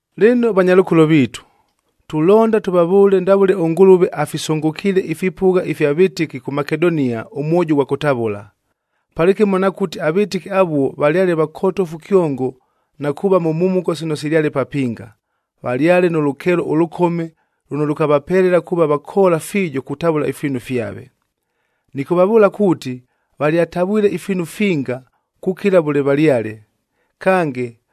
Lɨno vanyalʉkolo viitu, tulonda tʉvavʉʉle ndavʉle ʉNgʉlʉve afisʉngʉkiile ifipʉgha fya vɨtɨki kʉ Makedonia ʉmwojo ʉghwa kʉtavʉla. Palɨkɨmo nakʉti avɨtɨki avuo valyale vakotofu kyongo na kuuva mʉ mhumuko sino silyale papinga, valyale nʉ lʉkeelo ʉlʉkome lʉno lʉkavapelela kuuva vakoola fiijo kutavʉla ifiinu fyave. Nɨkʉvavʉʉla kuuti valyatavwile ifiinu finga, kukila vʉle valyale. Kange,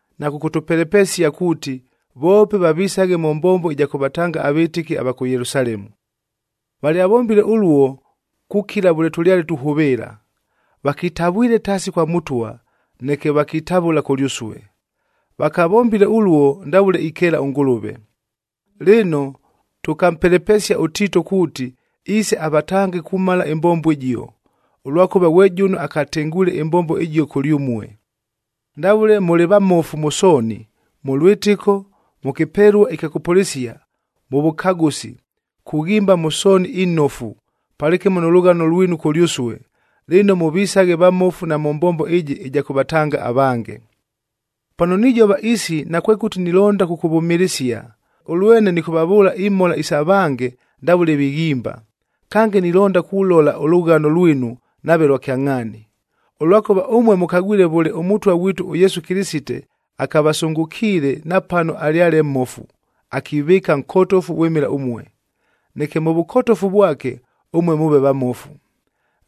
na kʉkʉtʉpelepesia kuuti, voope vavisaghe mʉ mbombo ɨja kʉvatanga avɨtɨki ava kʉ Yelusalemu. Valyavombile ʉluo kukila vʉle tʉlyale tuhʉvɨɨla. Vakitavwile taasi kwa Mʉtwa, neke vakitavʉla kʉlyʉsue. Vakavombile ʉluo ndavʉle ikeela ʉNgʉlʉve. Lɨno, tʉkampelepesia ʉTiito kuuti iise avatange kumala ɨmbombo ɨjio, ʉlwakʉva ghwe jʉno akatengwile ɨmbombo ɨjio kʉlyʉmue. Ndavʉle mʉlɨ vamofu mʉ sooni: mʉ lwɨtɨko, mʉ kɨpelua ɨkya kʉpʉlɨsia, mʉ vʉkagʉsi, kughimba mʉ sooni inofu, palɨkɨmo nʉ lʉghano lwinu kʉlyʉsue,a lɨno mʉvisaghe vamofu na mʉ mbombo ɨjɨ ɨja kʉvatanga avange. Pano nijova isi nakwekʉti nilonda kʉkʉvʉmɨlɨsia, ʉlwene nɨkʉvavʉʉla imhola isa vange ndavʉle vighimba, kange nilonda kulola ʉlʉghano lwinu nave lwa kyangʼhaani. Ʉlwakʉva ʉmue mʉkagwile vʉle ʉMʉtwa ghwitu ʉYesu Kɨlɨsite akavasʉngʉkiile, napano alyale mmofu, akivɨɨka nkotofu vwɨmɨla ʉmue, neke mʉ vʉkotofu vwake, ʉmue mʉʉve vamofu.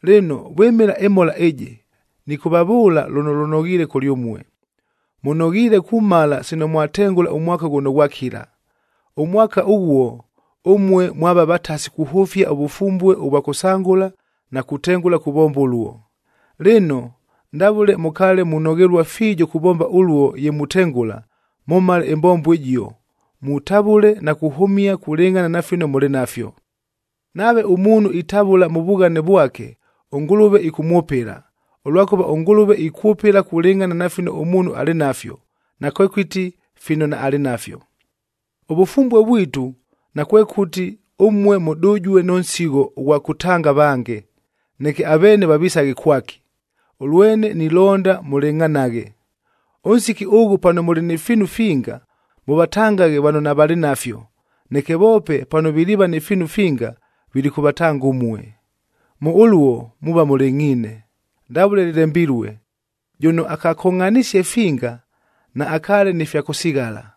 Lɨno, vwɨmɨla ɨmhola ɨjɨ, nɨkʉvavʉʉla lʉno lʉnoghiile kʉlyʉmue: Mʉnoghiile kumala sino mwatengʉla ʉmwaka ghʉno ghwakila. Ʉmwaka ʉghuo, ʉmue mwava vatasi kuhʉfia ʉvʉfumbue ʉvwa kʉsangʉla na kutengʉla kuvomba ʉluo. Lɨno, ndavʉle mʉkaale munoghelua fiijo kuvomba ʉluo ye mutengʉla, mʉmale ɨmbombo ɨjio, mutavʉle na kuhʉmia kulɨngʼhana na fino mʉlɨ nafyo. Nave ʉmuunhu itavʉla mʉ vughane vwake, ʉNgʉlʉve ɨkʉmwʉpɨla, ʉlwakʉva ʉNgʉlʉve ikwʉpɨla kulɨngʼhana na fino ʉmuunhu alɨ nafyo, nakwekʉti fino naalɨ nafyo. Ʉvʉfumbue vwitu, nakwekʉti ʉmue mʉdʉjue nʉ nsigho ʉghwa kʉtanga avange, neke aveene vavisaghe kwaki, ʉlwene nilonda mʉlɨngʼhanaghe. Ʉnsiki ʉghʉ pano mʉlɨ ni fiinu finga, mʉvatangaghe vano navalɨ nafyo, neke voope pano viliiva ni fiinu finga vilikʉvatanga ʉmue. Mʉ ʉluo muuva mʉlɨngʼhiine, ndavʉle lɨlembilue, “Jʉno akakongʼhanisie finga, naakaale ni fya kʉsighala,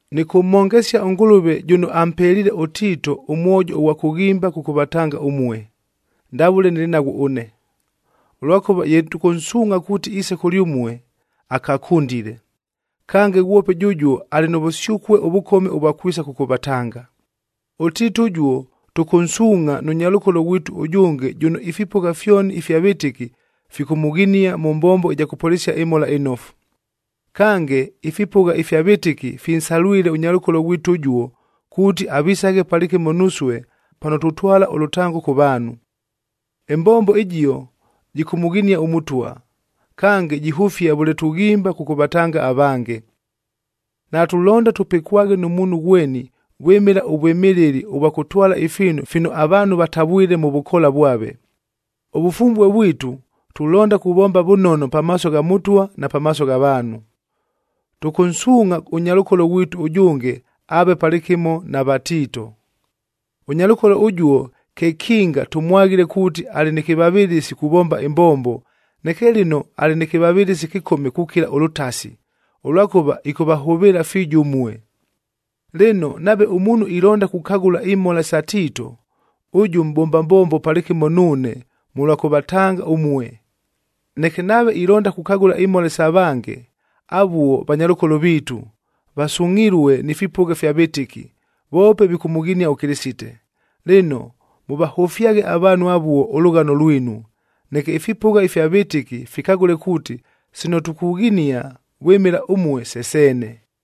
Nɨkʉmhongesia ʉNgʉlʉve jʉno ampeliile ʉTiito ʉmwojo ʉghwa kughimba kʉkʉvatanga ʉmue, ndavʉle nɨlɨ naghwo ʉne. Ʉlwakʉva ye tʉkʉnsʉʉma kuuti iise kʉlyʉmue, akakʉndile. Kange, ghwope jʉjuo alɨ nʉ vʉsyʉkue ʉvʉkome ʉvwa kwisa kʉkʉvatanga. ɄTiito ʉjuo, tʉkʉnsuungʼha nʉ nyalʉkolo ghwitu ʉjʉnge jʉno ifipʉgha fyoni ifya vɨtɨki fikʉmʉghinia mʉ mbombo ɨja kʉpʉlɨsia ɨMhola ɨNofu. Kange, ifipʉgha ifya vɨtɨki finsalwile ʉnyalʉkolo ghwitu ʉjuo, kuuti avisaghe palɨkɨmo nusue pano tutwala ʉlʉtango kʉ vaanhu. Ɨmbombo ɨjio, jɨkʉmʉghinia ʉMʉtwa, kange jihʉfia vʉle tughimba kʉkʉvatanga avange. Natulonda tʉpɨkwaghe nʉ muunhu ghweni vwɨmɨla ʉvwɨmɨlɨli ʉvwa kʉtwala ifiinu fino avaanhu vatavwile mʉ vʉkoola vwave. Ʉvʉfumbue vwitu, tulonda kuvomba vʉnono pamaaso gha Mʉtwa na pamaaso gha vaanhu. Tʉkʉnsuungʼha ʉnyalʉkolo ghwitu ʉjʉnge aave palɨkɨmo na va Tiito. Ʉnyalʉkolo ʉjuo kekinga tʉmwaghile kuuti alɨ nɨ kɨvavɨlɨsi kuvomba ɨmbombo, neke lɨno alɨ nɨ kɨvavɨlɨsi ɨkɨkome kukila ʉlʉtasi, ʉlwakʉva ɨkʉvahʉvɨɨla fiijo ʉmue. Lɨno, nave ʉmuunhu ilonda kukagʉla imhola sa Tiito, ʉjʉ mʼbomba mbombo palɨkɨmo nuune mʉlwa kʉvatanga ʉmue. Neke nave ilonda kukagʉla imhola sa vange, avuo vanyalʉkolo viitu, vasungʼhilue ni fipʉgha fya vɨtɨki, voope vikʉmʉghinia ʉKɨlɨsite. Lɨno, mʉvahʉfyaghe avaanhu avuo ʉlʉghano lwinu, neke ifipʉgha ifya vɨtɨki fikagʉle kuuti sino tukughinia vwɨmɨla ʉmue, se seene.